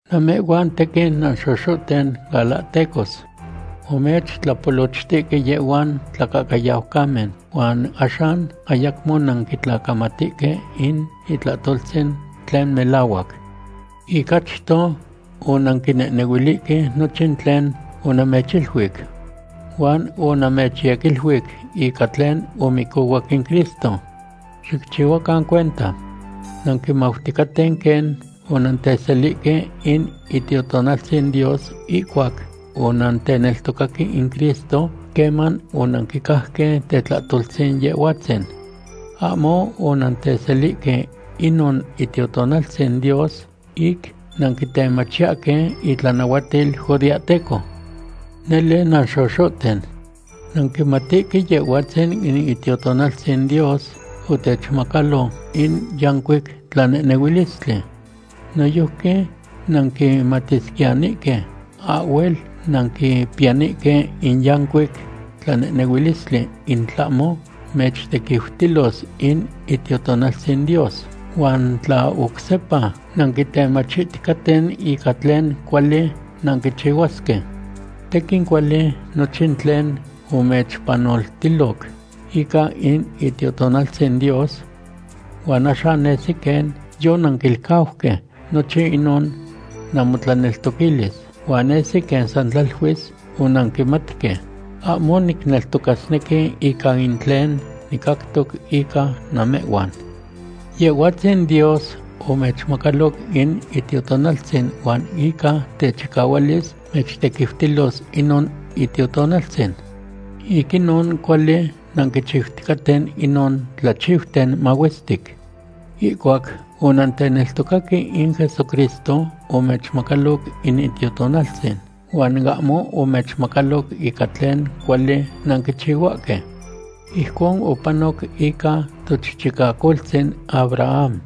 Namehhuan tequin nanxoxohten galahtecos. Omechtlapolochtihque yehhuan tlacahcayaucamen, huan axan ayacmo nanquitlacamatihque in itlahtoltzin tlen melahuac. Ic achto onanquinehnehuilihque nochin tlen onamechiluic. Huan onamechyequiluic ica tlen omicohuac in Cristo. ¡Xicchihuacan cuenta! Nanquimauticaten quen onanteselihque in Itiotonaltzin Dios ihcuac onanteneltocaque in Cristo, queman onanquicajque tetlahtoltzin Yehhuatzin. Ahmo onanteselihque inon Itiotonaltzin Dios ic nanquitemachiyahque itlanahuatil judeahteco. Nele nanxoxohten. Nanquimatihque Yehhuatzin in Itiotonaltzin Dios otechmacalo in yancuic tlanehnehuilistli. Noyojqui nanquimatisquiyanihque ahhuel nanquipiyanihque in yancuic tlanehnehuilistli in tlahmo mechtequiutilos in Itiotonaltzin Dios, huan tla oc sepa nanquitemachiticaten ica tlen cuali nanquichihuasque. Tequin cuali nochin tlen omechpanoltiloc ica in Itiotonaltzin Dios. Huan axan nesi quen yonanquilcauque nochin inon namotlaneltoquilis, huan nesi quen san tlaluis onanquimatque. Ahmo nicneltocasnequi ica in tlen nicactoc ica namehhuan. Yehhuatzin Dios omechmacaloc in Itiotonaltzin huan ica techicahualis mechtequitiltilos inon Itiotonaltzin. Ic inon, cuali nanquichiuticaten inon tlachiuten mahuestic. Ihcuac onanteneltocaque in Jesucristo, omechmacaloc in Itiotonaltzin, huan ahmo omechmacaloc ica tlen cuali nanquichihuahque. Ijcon opanoc ica tochichicacoltzin Abraham.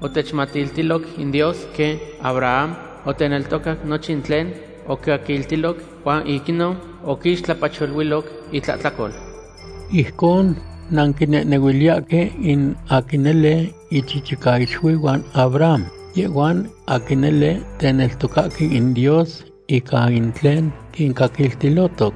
Otechmatiltiloc in Dios quen Abraham oteneltocac nochin tlen oquicaquiltiloc, huan ic inon oquixtlapacholuiloc itlahtlacol. Ijcon nanquinehnehuiliyahque in aquin nele ichichicaixuihuan Abraham, yehhuan aquin nele teneltocahque in Dios ica in tlen quincaquiltilotoc.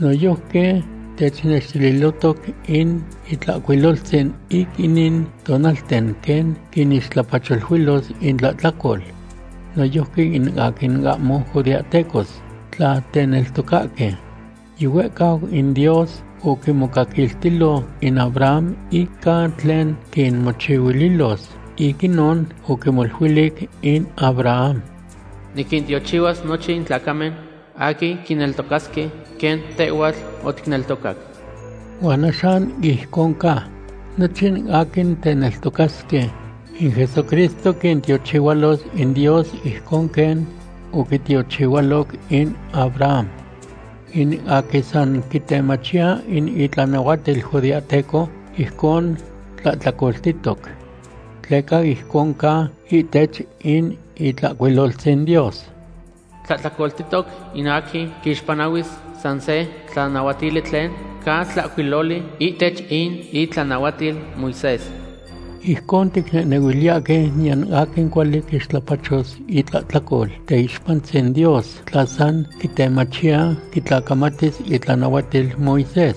Noyojqui technextililohtoc in Itlahcuiloltzin ic inin tonalten quen quinixtlapacholuilos intlahtlacol noyojqui in aquin ahmo judeahtecos tla teneltocahque. Yihuehcau in Dios oquimocaquiltilo in Abraham ica tlen quinmochihuililos. Ic inon oquimoluilic in Abraham: “Niquintiochihuas nochin tlacamen aquin quineltocasque quen tehhuatl oticneltocac.” Huan axan ijcon ca. Nochin aquin teneltocasque in Jesucristo quintiochihualos in Dios ijcon quen oquitiochihualoc in Abraham. In aquin san quitemachiya in itlanahuatil judeahteco, ijcon tlahtlacoltihtoc. Tleca ijcon ca ihtech in Itlahcuiloltzin Dios: “Tlahtlacoltihtoc in aquin quixpanahuis san se tlanahuatili tlen ca tlahcuiloli ihtech in itlanahuatil Moisés.” Ijcon ticnehnehuiliyahque niyan aquin cuali quixtlapachos itlahtlacol teixpantzin Dios tla san quitemachiya quitlacamatis itlanahuatil Moisés.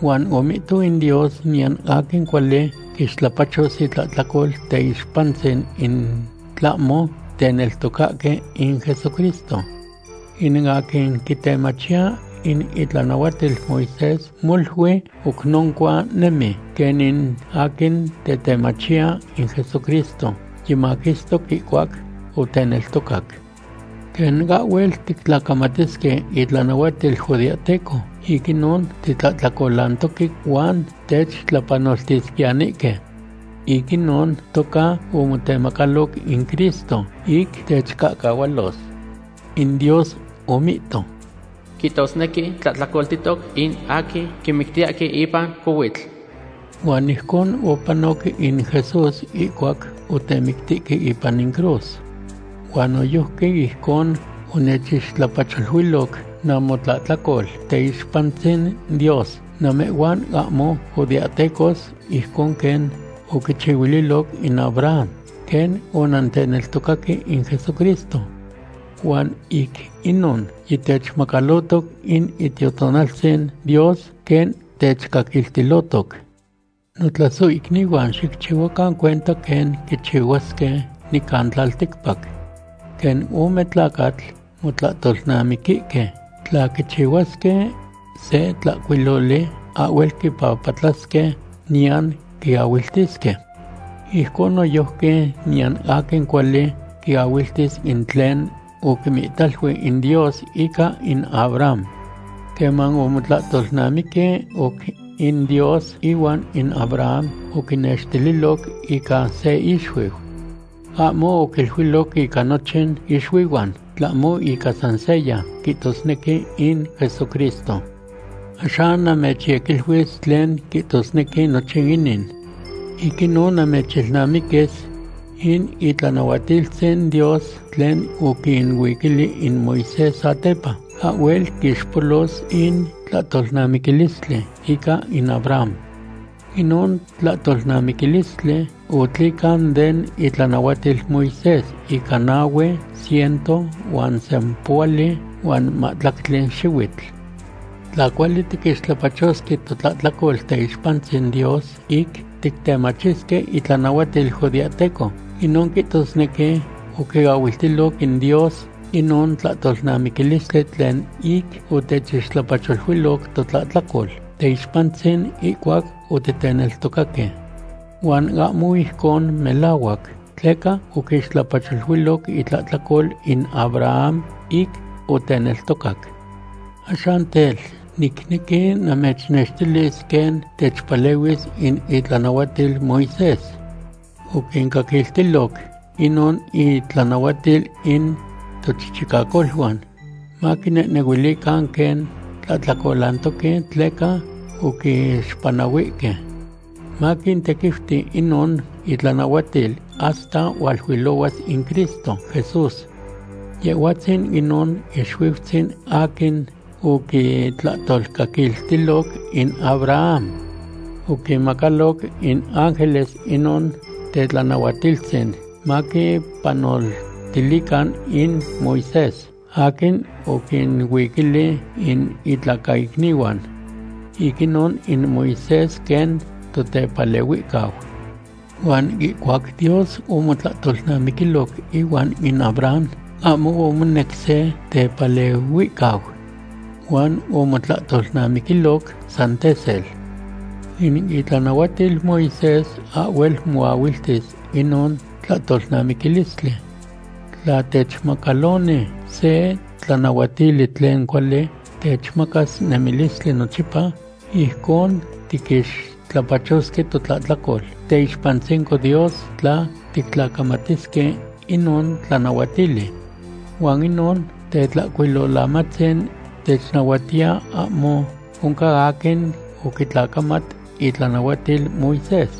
Huan omihto in Dios niyan aquin cuali quixtlapachos itlahtlacol teixpantzin in tlahmo teneltocahque in Jesucristo. In aquin quitemachiya in itlanahuatil Moisés molui oc noncua nemi, quen in aquin tetemachiya in Jesucristo yimaquistoc ihcuac oteneltocac. Quen ahhuel tictlacamatisque itlanahuatil judeahteco, ic inon titlahtlacolantoque huan techtlapanoltiyesquiyanihque. Ic inon toca omotemacaloc in Cristo ic techcahcahualos. In Dios omihto: “Quihtosnequi tlahtlacoltihtoc in aquin quimictiyahque ipan cohuitl.” Huan ijcon otepanoc in Jesús ihcuac otemictihque ipan in cruz. Huan noyojqui ijcon omechixtlapacholuiloc namotlahtlacol teixpantzin Dios namehhuan ahmo judeahtecos ijcon quen oquichihuililoc in Abraham, quen onanteneltocaque in Jesucristo. Huan ic inon yitechmacalotoc in Itiotonaltzin Dios, quen techcaquiltilohtoc. Notlasohicnihuan, xicchihuacan cuenta quen quichihuasque nican tlalticpac. Quen ome tlacatl motlahtolnamiquihque, tla quichihuasque se tlahcuiloli, ahhuel quipapatlasque niyan quiahuiltisque. Ijcon noyojqui niyan aquin cuali quiahuiltis in tlen oquimihtalui in Dios ica in Abraham. Queman omotlahtolnamiqui oc in Dios ihuan in Abraham, oquinextililoc ica se ixuiu. Ahmo oquiluiloc ica nochin ixuihuan, tlahmo ica san seya, quihtosnequi in Jesucristo. Axan namechyequiluis tlen quihtosnequi nochin inin. Ic inon namechilnamiquis. In itlanahuatiltzin Dios tlen oquinuiquili in Moisés satepa, ahhuel quixpolos in tlahtolnamiquilistli ica in Abraham. Inon tlahtolnamiquilistli otlican den itlanahuatil Moisés ica nahue ciento huan sempohuali huan mahtlactli xihuitl. Tla cuali tiquixtlapachosque totlahtlacol teixpantzin Dios ic tictemachisque itlanahuatil judeahteco, inon quihtosnequi oquiahuiltiloc in Dios inon tlahtolnamiquilistli tlen ic otechixtlapacholuiloc totlahtlacol teixpantzin ihcuac otiteneltocaque. Huan ahmo ijcon melahuac, tleca oquixtlapacholuiloc itlahtlacol in Abraham ic oteneltocac. Axan tel, nicnequi namechnextilis quen techpalehuis in itlanahuatil Moisés. Oquincaquiltiloc inon itlanahuatil in tochichicacoluan maquinenehuilican quen tlahtlacolantoque tleca oquixpanahuihque. Maquintequiuti inon itlanahuatil hasta hualuilohuas in Cristo Jesús. Yehhuatzin inon ixuiutzin aquin oquitlahtolcaquiltiloc in Abraham. Oquinmacaloc in ángeles inon tetlanahuatiltzin maquipanotilican in Moisés aquin oquinuiquili in itlacaicnihuan. Ic inon in Moisés quen totepalehuicau. Huan ihcuac Dios omotlahtolnamiquiloc ihuan in Abraham, ahmo omonec se tepalehuicau. Huan omotlahtolnamiquiloc san tesel. In itlanahuatil Moisés ahhuel moahuiltis inon tlahtolnamiquilistli. Tla techmacaloni se tlanahuatili tlen cuali techmacas nemilistli nochipa, ijcon tiquixtlapachosque totlahtlacol teixpantzinco Dios tla tictlacamatisque inon tlanahuatili. Huan inon Tetlahcuilolamatzin technahuatiya ahmo oncan aquin oquitlacamat itlanahuatil Moisés.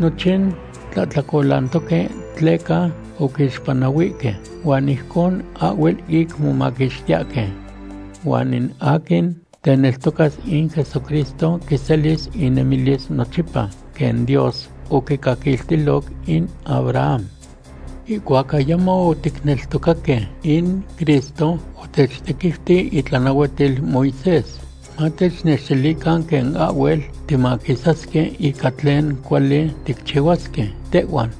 Nochin tlahtlacolantoque tleca oquixpanahuihque, huan ijcon ahhuel ic momaquixtiyahque. Huan in aquin teneltocas in Jesucristo quiselis inemilis nochipa quen Dios oquicaquiltiloc in Abraham. Ihcuac ayamo otiteneltocaque in Cristo, otechtequiuti itlanahuatil Moisés, matechnextilican quen ahhuel timaquisasque ica tlen cuali ticchihuasque tehhuan.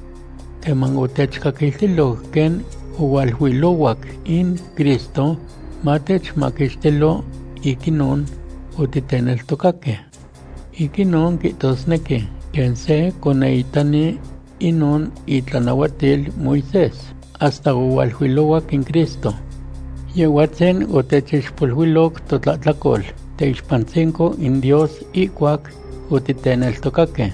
Queman otechcaquiltiloc quen ohualuilohuac in Cristo matechmaquixtilo, ic inon otiteneltocaque. Ic inon quihtosnequi quen se conehitani inon itlanahuatil Moisés, hasta ohualuilohuac in Cristo. Yehhuatzin otechixpoluiloc totlahtlacol teixpantzinco in Dios ihcuac otiteneltocaque.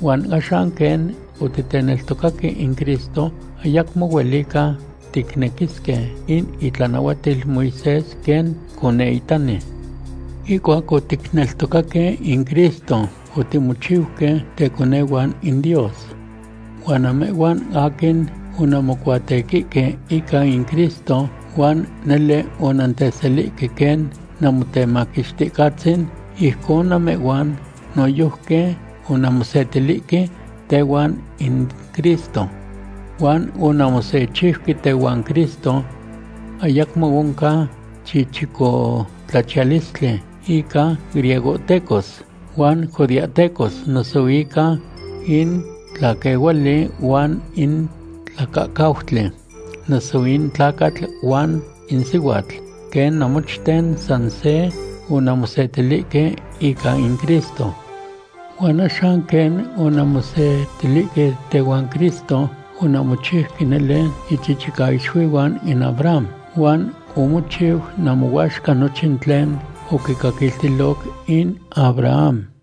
Huan axan quen otiteneltocaque in Cristo, ayacmo huelica ticnequisque in itlanahuatil Moisés quen conehitani. Ihcuac otiteneltocaque in Cristo, otimochiuque teconehuan in Dios. Huan namehhuan aquin onanmocuatequihque ica in Cristo huan nele onanteselihque quen Namotemaquixticatzin, ijcon namehhuan noyojqui onanmosetilihque tehuan in Cristo. Huan onanmosechiuque tehuan Cristo. Ayacmo oncan chichicotlachiyalistli ica griegohtecos huan judeahtecos, noso ica in tlaquehuali huan in tlacahcautli, noso in tlacatl huan in sihuatl, quen namochten san se onanmosetilihque ica in Cristo. Huan axan, quen onanmosetilihque tehuan Cristo, onanmochiuque nele ichichicaixuihuan in Abraham, huan omochiu namohuaxca nochin tlen oquicaquiltiloc in Abraham.